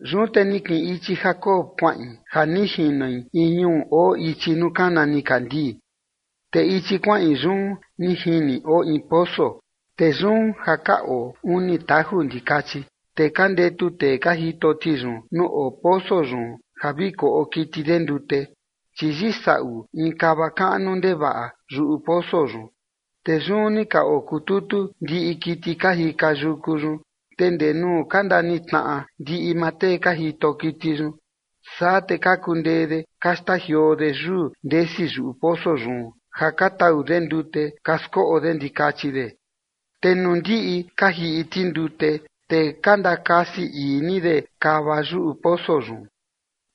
Yun te ni kiꞌin ichi Jacob kuaꞌin ja ni jinoi in ñuu oo ichi nuu kana nikandii. Te ichi kuaꞌin yun ni jini oo in poso, te yun ja ka oo uni taju ndikachi, te ka ndetu tee ka jito ti yun nuu oo poso yun ja vi koꞌo kiti de ndute, chi yisaꞌu in kava kaꞌnu ndevaꞌa yuꞌu poso yun. Te yun ni ka okututu ndiꞌi kiti ka jika yuku yun, te ndee nuu ka ndanitnaꞌa ndiꞌi maa tee ka jito kiti yun, saa te ka kundee de ka xtajioo de yuu ndesi yuꞌu poso yun ja ka tau de ndute ka skoꞌo de ndikachi de, te nuu ndiꞌi ka jiꞌi ti ndute, te ka ndakasi ii ni de kava yuꞌu poso yun.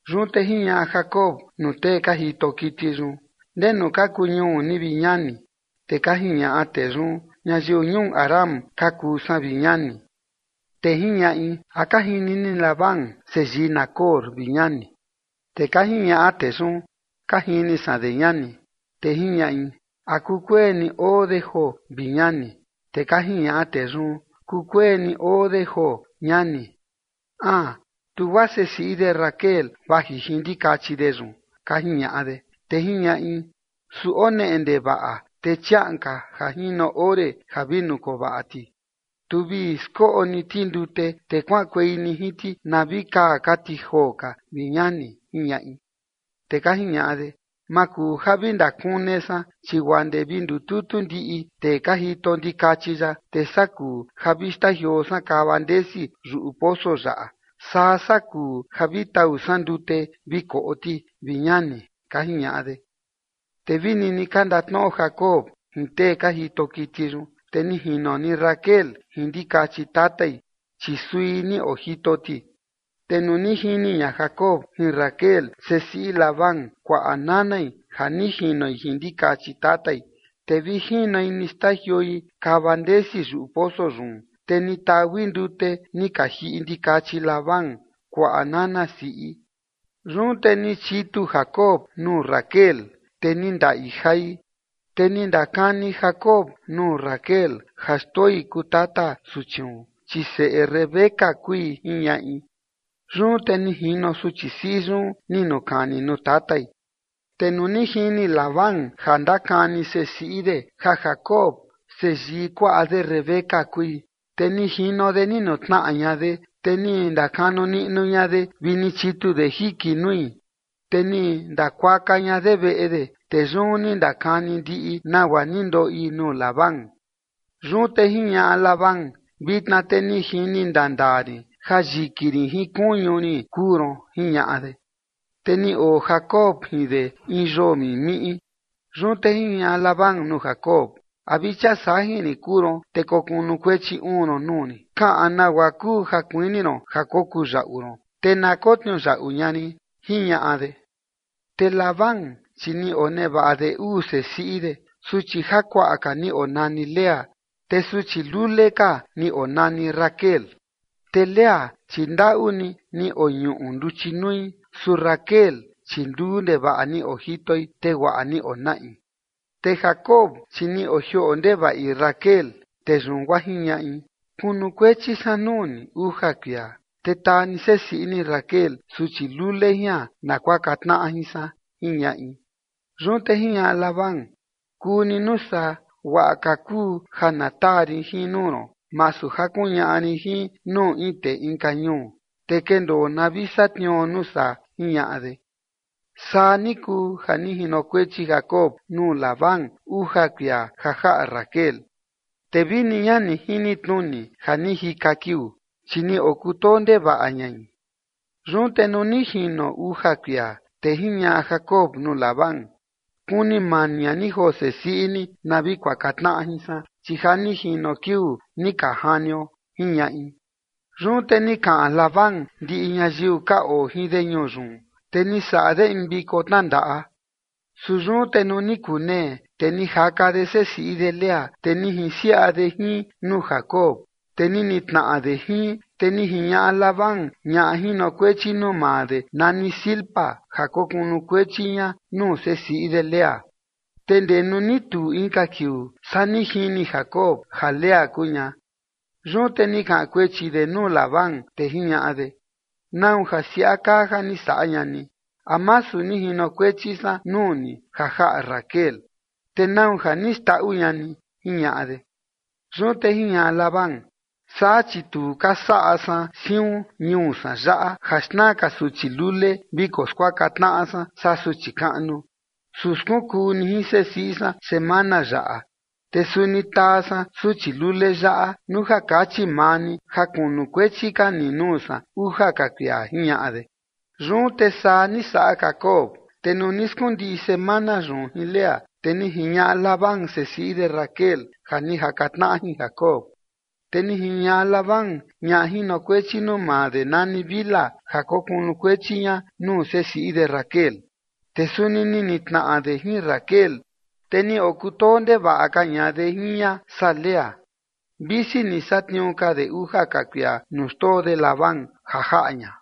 Yun te jiñaꞌa Jacob nuu tee ka jito kiti yun: ―¿Ndenu ka kuu ñuu ni, vi ñani? Te ka jiñaꞌa tee yun: ―Ñayiu ñuu Harán ka kuu san, vi ñani. Te jiñaꞌi: ―¿A ka jini ni Labán seyii Nacor, vi ñani? Te ka jiñaꞌa tee yun: ―Ka jini san de, ñani. Te jiñaꞌi: ―¿A kukueni oo de joo, vi ñani? Te ka jiñaꞌa tee yun: ―Kukueni oo de joo, ñani. Aan, tu guaa sesiꞌi de Raquel vaji jin ndikachi de yun ―ka jiñaꞌa de. Te jiñaꞌi: ―Su oo neꞌe ndevaꞌa, te chiaꞌan ka ja jino ore ja vi nukovaꞌa ti, tu vi skoꞌo ni ti ndute, te kuaꞌankuei ni jin ti na vi kaa ka ti joo ka, vi ñani ―jiñaꞌi. Te ka jiñaꞌa de: ―Ma kuu ja vi ndakune san, chi guaa ndee vi ndututu ndiꞌi tee ka jito ndikachi yaꞌa, te saa kuu ja vi xtajioo san kava ndesi yuꞌu poso yaꞌa, saa saa kuu ja vi tau san ndute vi koꞌo ti, vi ñani ―ka jiñaꞌa de. Te vi nini ka ndatnoꞌo Jacob jin tee ka jito kiti yun, te ni jino ni Raquel jin ndikachi tatai, chi sui ni ojito ti. Te nuu ni jini ña Jacob jin Raquel, sesiꞌi Labán, kuaꞌa nanai ja ni jinoi jin ndikachi tatai, te vi jinoi ni xtajioi kava ndesi yuꞌu poso yun, te ni taui ndute ni ka jiꞌi ndikachi Labán, kuaꞌa nana siꞌi. Yun te ni chitu Jacob nuu Raquel, te ni ndaꞌi jai. Te ni ndakani Jacob nuu Raquel ja xtoi kuu tata suchiun, chi seꞌe Rebeca kui, jiñaꞌi. Yun te ni jino suchi siꞌi yun ni nukani nuu tatai. Te nuu ni jini Labán ja ndakani sesiꞌi de ja Jacob, seyii kuaꞌa de Rebeca kui, te ni jino de ni nutnaꞌa ña de, te ni ndakanu niꞌnu ña de vi ni chitu de jiki nui, te ni ndakuaka ña de veꞌe de. Te yun ni ndakani ndiꞌi nagua ni ndoꞌi nuu Labán. Yun te jiñaꞌa Labán: ―Vitna te ni jini ndaa ndaa rin ja yiki rin jin kuñu rin kuu ron ―jiñaꞌa de. Te ni oo Jacob jin de in yoo mimiꞌi. Yun te jiñaꞌa Labán nuu Jacob: ―¿A vi chia sajin rin kuu ron, te kokunukuechi uun ron nuu rin? Kaꞌan nagua kuu ja kuini ron ja kokuu yaꞌu ron, te na kotniuyaꞌu ña rin ―jiñaꞌa de. Te Labán, chi ni onevaꞌa de uu sesiꞌi de. Suchi jakuaꞌa ka ni onani Lea, te suchi lule ka ni onani Raquel. Te Lea, chi ndaꞌu ni ni oñuꞌu nduchi nui, su Raquel chi luu ndevaꞌa ni ojitoi, te guaꞌa ni onaꞌi. Te Jacob, chi ni ojioꞌo ndevaꞌi Raquel, te yun guaa jiñaꞌi: ―Kunukuechi san nuu ni uja kuia, te taa ni sesiꞌi ni Raquel, suchi lule jian, na kuaka tnaꞌa jin san ―jiñaꞌi. Yun te jiñaꞌa Labán: ―Kuu ni nuu saa, guaꞌa ka kuu ja na taa rin jin nuu ron, masu ja kuñaꞌa rin jin nuu in tee inka ñuu, te kendoo na vi satniuo nuu saa ―jiñaꞌa de. Saa ni kuu ja ni jinokuechi Jacob nuu Labán uja kuia ja jaꞌa Raquel, te vini ña ni jini tnuni ja ni jika kiuu, chi ni okutoo ndevaꞌa ñai. Yun te nuu ni jino uja kuia, te jiñaꞌa Jacob nuu Labán: ―Kuni mani ña ni joo sesiꞌi ni na vi kuaka tnaꞌa jin san, chi ja ni jino kiuu ni ka janio ―jiñaꞌi. Yun te ni kaꞌan Labán ndiꞌi ñayiu ka oo jin de ñuu yun, te ni saꞌa de in viko tnandaꞌa. Su yun te nuu ni kunee, te ni jaka de sesiꞌi de Lea, te ni jinsiaꞌa de jin nuu Jacob, te ni nitnaꞌa de jin. Te ni jiñaꞌa Labán ñaꞌa jinokuechi nuu maa de nani Zilpa ja kokunukuechi ña nuu sesiꞌi de Lea. Te ndee nuu ni tuu inka kiuu, saa ni jini Jacob ja Lea kuu ña. Yun te ni kaꞌan kuechi de nuu Labán, te jiñaꞌa de: ―¿Nau ja saa siaꞌa kaa ja ni saꞌa ña ni? ¿A masu ni jinokuechi san nuu ni ja jaꞌa Raquel? ¿Te nau ja ni xndaꞌu ña ni? ―jiñaꞌa de. Yun te jiñaꞌa Labán: ―Saa chi tu ka saꞌa san siun ñuu san yaꞌa ja xna ka suchi lule viko skuaka tnaꞌa san saa suchi kaꞌnu. Su skunkuu ni jin sesiꞌi san semana yaꞌa, te suni taa san suchi lule yaꞌa nuu ja kachi maa ni ja kunukuechi ka ni nuu san uja ka kuia ―jiñaꞌa de. Yun te saa ni saꞌa Jacob, te nuu ni skundiꞌi semana yun jin Lea, te ni jiñaꞌa Labán sesiꞌi de Raquel ja ni jaka tnaꞌa ña jin Jacob. Te ni jiñaꞌa Labán ñaꞌa jinokuechi nuu maa de nani Bilha ja kokunukuechi ña nuu sesiꞌi de Raquel. Te suni ni nitnaꞌa de jin Raquel, te ni okutoo ndevaꞌa ka ña de jin ña saa Lea, visi ni satniuu ka de uja ka kuia nuu xtoo de Labán ja jaꞌa ña.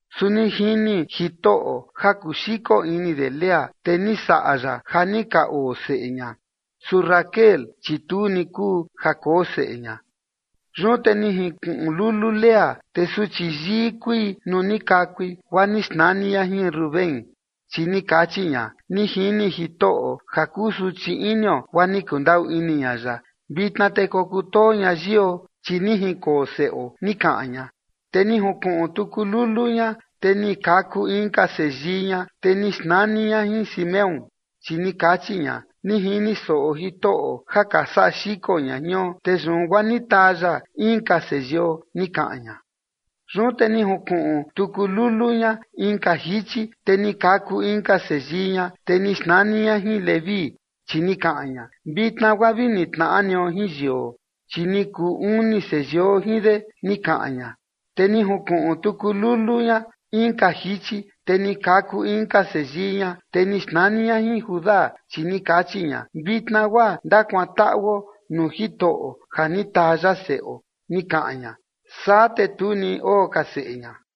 Su ni jini Jitoꞌo ja kuxiko ini de Lea, te ni saꞌa ya ja ni ka oo seꞌe ña. Su Raquel, chi tu ni kuu ja koo seꞌe ña. Yun te ni jinkuꞌun lulu Lea, te suchi yii kui nuu ni kakui, guaa ni xnani ña jin Rubén, chi ni kachi ña: ―Ni jini Jitoꞌo ja kusuchi inio, guaa ni kundaꞌu ini ña ya. Vitna te kokutoo ña yio, chi ni jinkoo seꞌo ―ni kaꞌan ña. Te ni junkuꞌun tuku lulu ña, te ni kaku inka seyii ña, te ni xnani ña jin Simeón, chi ni kachi ña: ―Ni jini soꞌo Jitoꞌo ja ka saꞌa xiko ña jion, te yun guaa ni taa ya inka seyio ―ni kaꞌan ña. Yun te ni junkuꞌun tuku lulu ña inka jichi, te ni kaku inka seyii ña, te ni xnani ña jin Leví, chi ni kaꞌan ña: ―Vitna guaa vi nitnaꞌa nio jin yio, chi ni kuu uni seyio jin de ―ni kaꞌan ña. Te ni junkuꞌun tuku lulu ña inka jichi, te ni kaku inka seyii ña, te ni xnani ña jin Judá, chi ni kachi ña: ―Vitna guaa ndakuantaꞌuo nuu Jitoꞌo ja ni taa ya seꞌo ―ni kaꞌan ña. Saa te tu ni oo ka seꞌe ña.